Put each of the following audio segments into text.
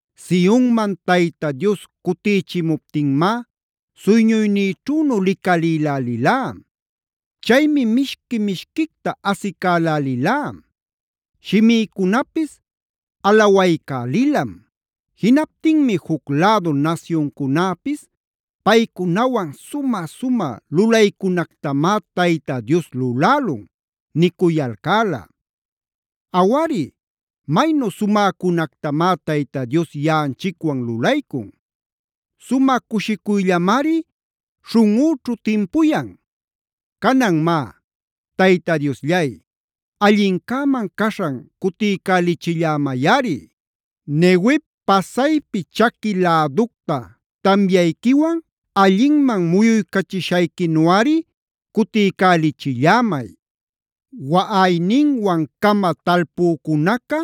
Sionman Tayta Dios cutïchimuptinmá suyñuynïćhünu licalïlälilá. Chaymi mishqui-mishquicta asicälälilá. Shimïcunapis alawaycälilam. Jinaptinmi juc lädu nasyuncunäpis: “Paycunawan sumä-sumä lulaycunactamá Tayta Dios lulälun” nicuyalcäla. Awari, maynu sumäcunactamá Tayta Dios yaꞌanchicwan lulaycun. Sumä cushicuyllamari śhunꞌüćhu timpuyan. Canan má, Tayta Diosllay, allincäman caśhan cutiycälichillämayꞌari. Neguev pasaypi chaqui läducta tamyayquiwan allinman muyuycachishayquinuꞌari cutiycälichillämay. Waꞌayninwan-cama talpucücunaca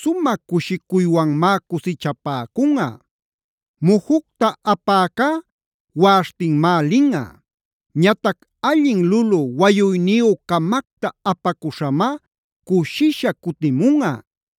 sumä cushicuywanmá cusichapäcunꞌa. Mujucta apäcá waꞌaśhtinmá linꞌa. Ñatac allin lulü wayuyniyü-camacta apacuśhamá cushisha cutimunꞌa.